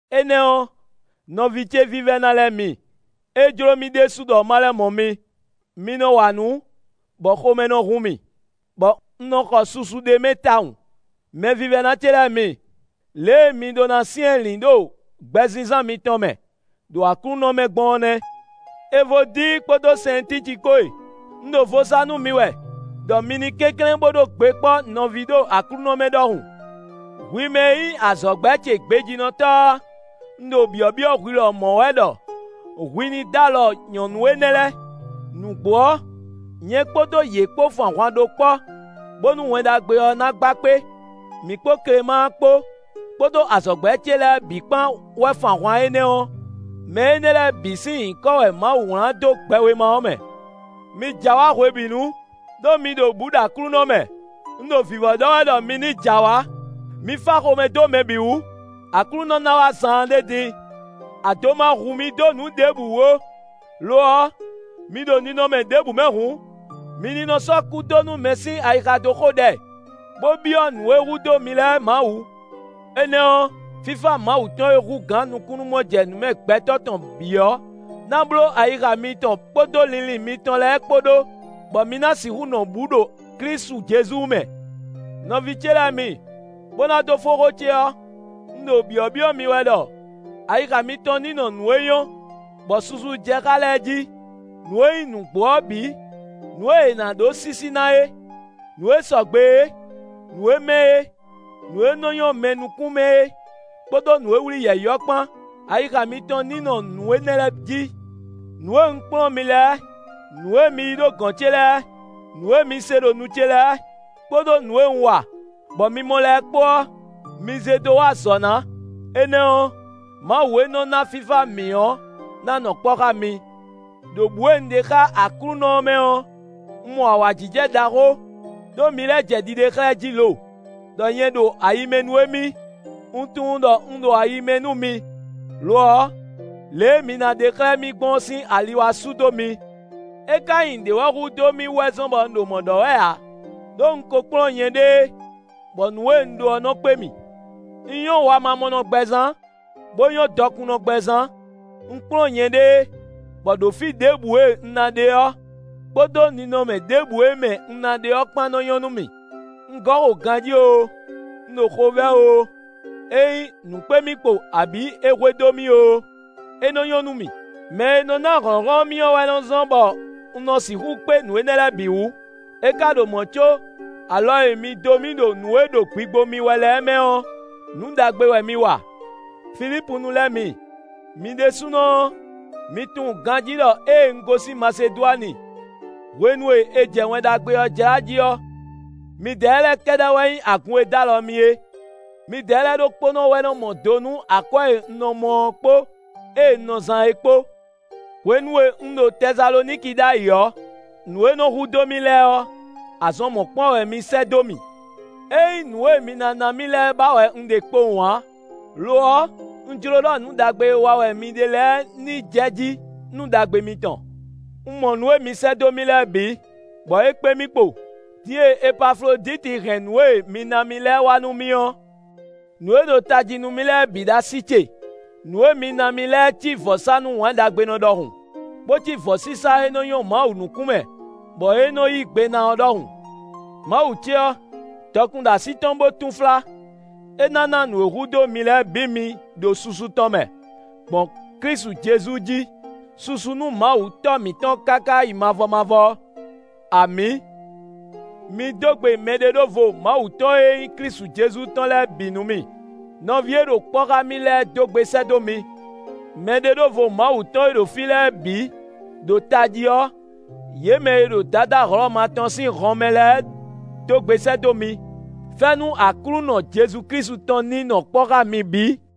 Énɛ́ ɔ́, nɔví ce vívɛ́ná lɛ́ɛ mi, é jló mì ɖésú ɖɔ ma lɛ́ mɔ mi; mi nɔ wa nǔ, bɔ xomɛ nɔ hun mì, bɔ un nɔ xɔ susu ɖ'é mɛ tawun; mɛvívɛ́ná ce lɛ́ɛ mi, lě e mi ɖó ná syɛ́nlǐn ɖo gbɛzínzán mitɔn mɛ, ɖo Aklúnɔ mɛ gbɔn ɔ́ nɛ́. Evodíi kpódó Sɛntíci kpó e, un ɖo vo sa nú mi wɛ, ɖɔ mi ní kɛnklɛ́n bo ɖó gbe kpɔ́ nɔví ɖo Aklúnɔ mɛ ɖɔhun. Hwi mɛ e nyí azɔ̌gbɛ́ ce gbejínɔtɔ́ ɔ́, un ɖo byɔ̌byɔ́ hwi lɔmɔ̌ wɛ ɖɔ hwi ní dó alɔ nyɔ̌nu énɛ́ lɛ́ɛ; nǔgbó ɔ́, nyɛ kpódó yě kpó fun ahwan ɖó kpɔ́, bónú Wɛn Ɖagbe ɔ́ ná gba kpé: mǐ kpó Klemáa kpó, kpódó azɔ̌gbɛ́ ce lɛ́ɛ bǐ kpán wɛ fun ahwan énɛ́ ɔ́; mɛ énɛ́ lɛ́ɛ bǐ sín nyǐkɔ wɛ Mawu wlán dó gbɛwéma ɔ́ mɛ. Mi jɛ awǎ hwebǐnu, ɖó mi ɖo bǔ ɖo Aklúnɔ mɛ; un ɖo vǐvɔ́ ɖɔ wɛ ɖɔ mi ní jɛ awǎ. Mi fá xomɛ dó mɛ bǐ wú. Aklúnɔ ná wá zaanɖé din. Ado ma hu mi dó nǔ ɖěbǔ wú ó; lo ɔ́, mi ɖo ninɔmɛ ɖěbǔ mɛ hǔn, mi ní nɔ sɔ́ kúdónúmɛ sín ayixa dó xo ɖɛ, bó byɔ́ nǔ e hudó mi lɛ́ɛ Mawu. Énɛ́ ɔ́, fífá Mawu tɔn e hú gǎn nukúnnú-mɔjɛnǔmɛ gbɛtɔ́ tɔn bǐ ɔ́ ná bló ayixa mitɔn kpódó linlin mitɔn lɛ́ɛ kpó ɖó, bɔ mi ná sixú nɔ bǔ ɖo Klísu Jezu mɛ. Nɔví ce lɛ́ɛ mi, bó ná dó fó xó ce ɔ́, un ɖo byɔ̌byɔ́ mi wɛ ɖɔ ayixa mitɔn ní nɔ nǔ e nyɔ́, bɔ susu jɛ xá lɛ́ɛ jí: nǔ e nyí nǔgbó ɔ́ bǐ, nǔ e è nǎ ɖó sísí ná é, nǔ e sɔgbe é, nǔ e mɛ́ é, nǔ e nɔ nyɔ́ mɛ nukún mɛ é kpódó nǔ e wlí yɛ̌yi ɔ́ kpán; ayixa mitɔn ní nɔ nǔ énɛ́ lɛ́ɛ jí. Nǔ e un kplɔ́n mi lɛ́ɛ, nǔ e mi yí ɖo gɔ̌n ce lɛ́ɛ, nǔ e mi se ɖo nu ce lɛ́ɛ, kpódó nǔ e un wa, bɔ mi mɔ lɛ́ɛ kpó ɔ́, mi zé dó wa azɔ̌ ná; énɛ́ ɔ́, Mawu e nɔ ná fífá mǐ ɔ́ ná nɔ kpɔ́ xá mi. Đo bǔ e un ɖe xá Aklúnɔ ɔ́ mɛ ɔ́, un mɔ awǎjijɛ ɖaxó, ɖó mi lɛ́ jɛ ɖiɖe xlɛ́ jí lo, ɖɔ nyɛ ɖo ayi mɛ nú émí. Un tunwun ɖɔ un ɖo ayi mɛ nú mi; lo ɔ́, lě e mi ná ɖe xlɛ́ mì gbɔn ɔ́ sín ali wá sú dó mi. É ka nyí nǔɖé wɛ hudó mì wɛ zɔ́n bɔ un ɖo mɔ̌ ɖɔ wɛ ǎ, ɖó un ko kplɔ́n nyɛɖée, bɔ nǔ e un ɖó ɔ́ nɔ kpé mì. Un nyɔ́ wamamɔnɔgbɛ zán, bó nyɔ́ dɔkunnɔgbɛ zán. Un kplɔ́n nyɛɖée, bɔ ɖo fí ɖěbǔ e un ná ɖe ɔ́, kpódó ninɔmɛ ɖěbǔ e mɛ un ná ɖe ɔ́ kpán nɔ́ nyɔ́ nú mì; un gɔ́ xo ganjí oo, un ɖo xovɛ́ oo, ényí nǔ kpé mì kpo abǐ é hwedó mì oo, é nɔ nyɔ́ nú mì. Mɛ e nɔ ná hlɔ̌nhlɔ́n mì ɔ́ wɛ nɔ zɔ́n, bɔ un nɔ sixú kpé nǔ énɛ́ lɛ́ɛ bǐ wú. É ka ɖo mɔ̌ có, alɔ e mi dó mì ɖo nǔ e ɖo gbigbo mì wɛ lɛ́ɛ mɛ ɔ́, nǔ ɖagbe wɛ mi wa. Filípunu lɛ́ɛ mi, mi ɖésúnɔ ɔ́, mi tunwun ganjí ɖɔ ée un gosín Masedwani, hwenu e è jɛ Wɛn Ɖagbe ɔ́ jlá jí ɔ́, midɛɛ lɛ́ɛ kɛ́ɖɛ́ wɛ nyí agun e dó alɔ mì é; midɛɛ lɛ́ɛ ɖokpónɔ wɛ mɔ do nú akwɛ́ e un nɔ mɔ ɔ́ kpó ée un nɔ zán é kpó. Hwenu e un ɖo Tɛsaloniki ɖ'ayǐ ɔ́, nǔ e nɔ hudó mì lɛ́ɛ ɔ́, azɔn mɔ̌kpán wɛ mi sɛ́ dó mì. É nyí nǔ e mi ná ná mì lɛ́ɛ ba wɛ un ɖe kpowun ǎ; lo ɔ́, un jló ɖɔ nǔ ɖagbe e wa wɛ mi ɖe lɛ́ɛ ní jɛ jí nú ɖagbe mitɔn. Un mɔ nǔ e mi sɛ́ dó mì lɛ́ɛ bǐ, bɔ é kpé mì kpo; din e Epafloditi hɛn nǔ e mi ná mì lɛ́ɛ wá nú mì ɔ́, nǔ e ɖo tají nú mì lɛ́ɛ bǐ ɖo así ce; nǔ e mi ná mì lɛ́ɛ cí vɔ̌sánú wǎnɖagbenɔ ɖɔhun, bó cí vɔ̌sísá e nɔ nyɔ́ Mawu nukún mɛ, bɔ é nɔ yí gbe ná ɔ́ ɖɔhun. Mawu ce ɔ́, dɔkun ɖo así tɔn bó túnflá; é ná ná nǔ e hudó mi lɛ́ɛ bǐ mi ɖo susu tɔn mɛ, gbɔn Klísu Jezu jí. Susu nú Mawu Tɔ́ mǐtɔn káká yi mavɔ mavɔ. Amǐ. Mi dó gbe mɛɖeɖóvo Mawu tɔn e nyí Klísu Jezu tɔn lɛ́ɛ bǐ nú mì. Nɔví e ɖo kpɔ́ xá mì lɛ́ɛ dó gbe sɛ́ dó mi. Mɛɖeɖóvo Mawu tɔn e ɖo fí lɛ́ɛ bǐ, ɖo tají ɔ́, yě mɛ e ɖo Dadá Hlɔ̌ma tɔn sín hɔnmɛ lɛ́ɛ dó gbe sɛ́ dó mi. Fɛ́nú Aklúnɔ Jezu Klísu tɔn ní nɔ kpɔ́ xá mi bǐ.